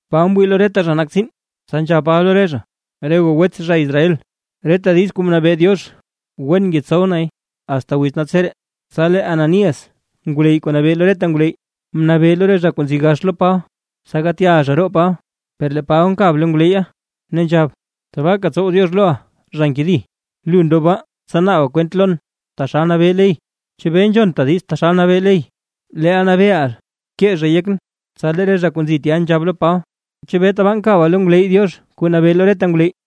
Paba mwii lo reta zha nak tsiin, tsa nzhab Paba lo re zha: ―Re goo wets zha Israel, reta diiz kuu mnabee Diox wen ngetsow nay asta wiz naltseree. Tsa lee Ananías ngwleyy kuu nabee lo reta ngwleyy, mnabee lo re zha kuu nzi gax lo Paba, tsa gaat ya zha roo Paba. Per lee Paba mkab lo ngwleyya, ne nzhab: ―¡Tabaaka tsow Diox loʼa, zha nkedi! Lu ndob baa tsa naaba kwent lon taxal nabee ley. ¿Chebee nzhonta diiz taxal nabee ley, leel nabeeʼa kee zhay yekʼn? Tsa lee re zha kuu nzi tya nzhab lo Paba: ―¿Chebee tabaa nkaba lo ngwleyy Diox kuu nabee lo reta ngwleyy?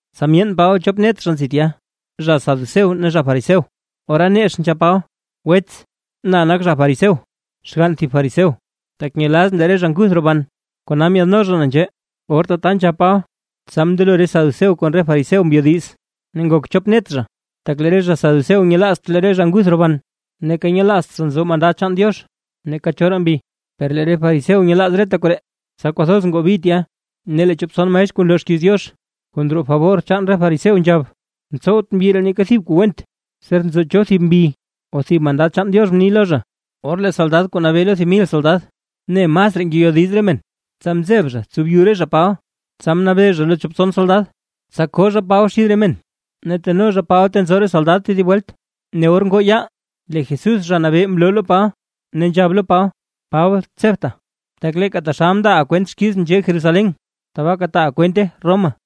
Tsa myeen Paba chop net zha nzi tya, zha saduceo ne zha Fariseo, ora nex nzhab Paba: ―Wets, na nak zha fariseo, xgann thib zha fariseo, tak nyelazʼn lee re zha nguth roban, kona myaadno zha na nzhee. Or tata nzhab Paba, tsa mndelo re saduceo kon re fariseo mbyo diiz, ne ngok chop net zha. Tak lee re zha Saduceo nyelaazt lee re zha nguth roban, neeka nyelaazt zha nzo mandad chaan Diox neeka choraa mbi, per lee re fariseo nyelaaz reta koree. Tsa kwathoz ngoo bi tya ne lee chop tson maestr kuu nloo xkiiz Diox, kuu ndroo fabor chaan re fariseo nzhab: ―Mtsowt mbyi ree neeka thib kuu went, ser nzo cho thib mbi o thib mandad chaan Diox mni lo zha. Or lee soldad kuu nabee lo thib mil soldad mne masraa ngeyodiz re men, tsa mzeb zha tsow byu re zha Paba, tsa mnabee zha lo chop tson soldad, tsa koo zha Paba xid re men, ne teno zha Paba ta nzo re soldad tedib welt. Ne or ngoo yaal lee Jesús Zha Nabee mloo lo Paba ne nzhab lo Paba: ―Paba tsebta, tak leeka taxal mndaaʼa kwent xkizʼn nzhee Jerusalén, tabaaka taaʼa kwente Roma.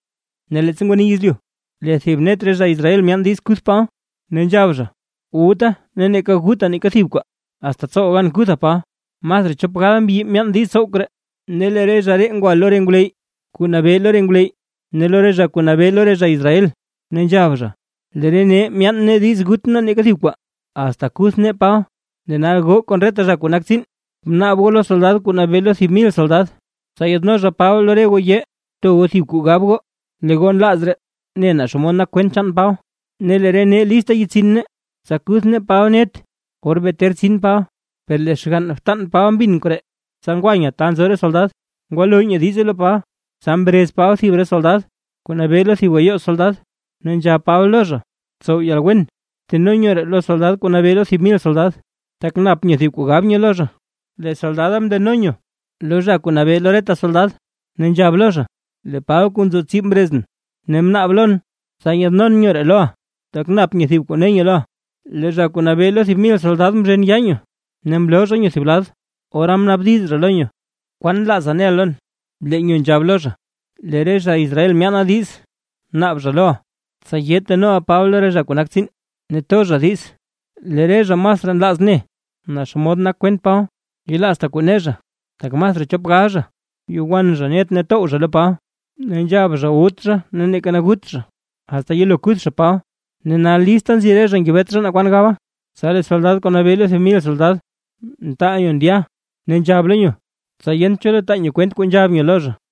Ne leettsa ngwani yezlyu, lee thib net re zha Israel myaan diiz kuth Paba, ne nzhab zha: “Wutaa neeka gutaa neeka thib kwaa, asta tsowaa gan kuthaa Paba”. Masraa chop gal mbyi myaan diiz tsow koree. Ne lee re zha ree ngwa lo re ngwleyy kuu nabee lo re ngwleyy ne lo re zha kuu nabee lo re zha Israel, ne nzhab zha: ―Lee re nee myaan nee diiz wut nee neeka thib kwaa, asta kuth nee Paba. Lee nal goo kon reta zha kuu nak tsiin, bnaab goo lo soldad kuu nabee lo thib mil soldad, tsa yaadno zha Paba lo re goo yee, to goo thib kuu gab goo, lee goo nlaaz raa ne naa xomod nak kwent chaan Paba, ne lee re nee list yetsin nee, tsa kuth nee Paba net, or bee ter tsin Paba. Per lee xgann btan Paba mbin koree, tsa ngwa nyo ta nzo re soldad ngwalo nyo diize lo Paba. Tsa mrez Paba thib re soldad kuu nabee lo thib gayoo soldad ne nzhab Paba lo zha: ―Tsow yalwen bteno nyo ree lo soldad kuu nabee lo thib mil soldad, tak nap nyo thib kuu gab nyo lo zha. Lee soldada mndeno nyo lo zha kuu nabee lo reta soldad ne nzhab lo zha: ―Lee Paba kuu nzo tsib mrezʼn ne mnaab lon, tsa yaadnon nyo ree loʼa, tak nap nyo thib kuu ne nyo loʼa. Lee zha kuu nabee lo thib mil soldad mzhen yaa nyo, ne mloo zha nyo thib lad, ora mnaabdiz zha lo nyo: ―¿Kwan nlaaza neʼa lon? Lee nyo nzhab lo zha: ―Lee re zha Israel myaana zha diiz naab zha loʼa, tsa yee tenoʼa Paba lo re zha kuu nak tsiin, ne to zha diiz lee re zha masraa nlaaz ne naa xomod nak kwent Paba. Yelaazta kuu ne zha, tak masraa chop gal zha, yo wan zha net tow zha lo Paba, ne nzhaba zha wut zha neeka gut zha, asta yelo kuth zha Paba, ne nal lista nzi re zha ngebet zha naa kwan gaba. Tsa lee soldad kuu nabee lo thib mil soldad mtaal nyo ndya ne nzhab zha lo nyo; tsa yent cho lo taa nyo kwent kuu nzhab nyo lo zha.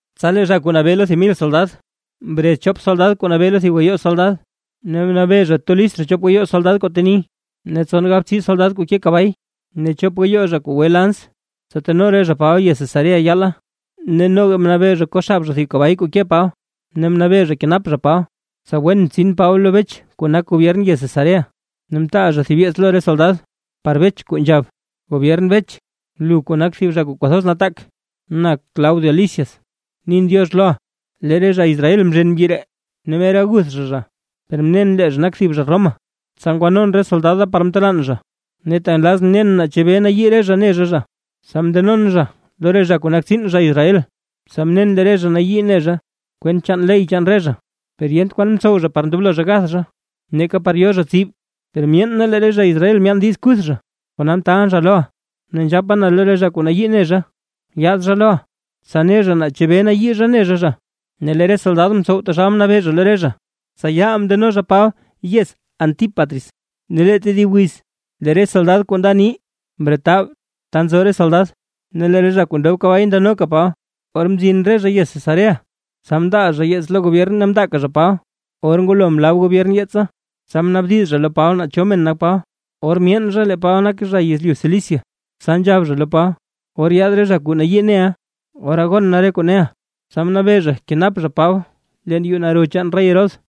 Tsa lee zha kuu nabee lo thib mil soldad, mrez chop soldad kuu nabee lo thib gayoo soldad ne mnabee zha to list zha chop gayoo soldad kuu teni, ne tson galbtsii soldad kuu ke kabay ne chop gayoo zha kuu gwe lans, tsa teno re zha Paba yez Cesarea yaala. Ne noga mnabee zha ko xab zha thib kabay kuu ke Paba, ne mnabee zha kenap zha Paba, tsa wen tsin Paba lo Bech kuu nak gobyern yez Cesarea. Ne mtaal zha thib yeets lo re soldad par Bech kuu nzhab: “Gobyern Bech, lu kuu nak thib zha kuu kwathoz nataak. Na Claudio Lisias nin “diox” loʼa. Lee re zha Israel mzhen mbyi ree ne mer aguth zha zha, per mnen lee zha nak thib zha Roma, tsa ngwanon re soldad da par mtelaan zha. Ne tak nlazʼn nen naa chebee nayii re zha ne zha zha, tsa mndenon zha lo re zha kuu nak tsiin zha Israel, tsa mnen lee re zha nayii ne zha kwent chaan ley chaan re zha, per yent kwan mtsow zha par ndoblo zha gath zha neeka par yo zha tsib. Per myeen na lee re zha Israel myaan diiz kuth zha, kona mtaalʼn zha loʼa, ne nzhapa na lo re zha kuu nayii ne zha, yaad zha loʼa, tsa ne zha naa chebee nayii zha ne zha zha.” Ne lee re soldad mtsow taxal mnabee zha lo re zha, tsa yaal mndeno zha Paba yez Antípatris. Ne lee tedib wiz lee re soldad kuu nda ni mretab ta nzo re soldad, ne lee re zha kuu ndob kabay mndenoka Paba. Or mzin re zha yez Cesarea, tsa mndaa zha yeets lo gobyern ne mndaaka zha Paba. Or ngwalo mlab gobyern yeetsa, tsa mnaabdiz zha lo Paba naa cho men nak Paba, or myeen zha lee Paba nak zha yezlyu Cilicia, tsa nzhab zha lo Paba: ―Or yaad re zha kuu nayii neʼa, ora gon na re kuu neʼa. Tsa mnabee zha kenap zha Paba leen yuu naro chaan rey Herodes.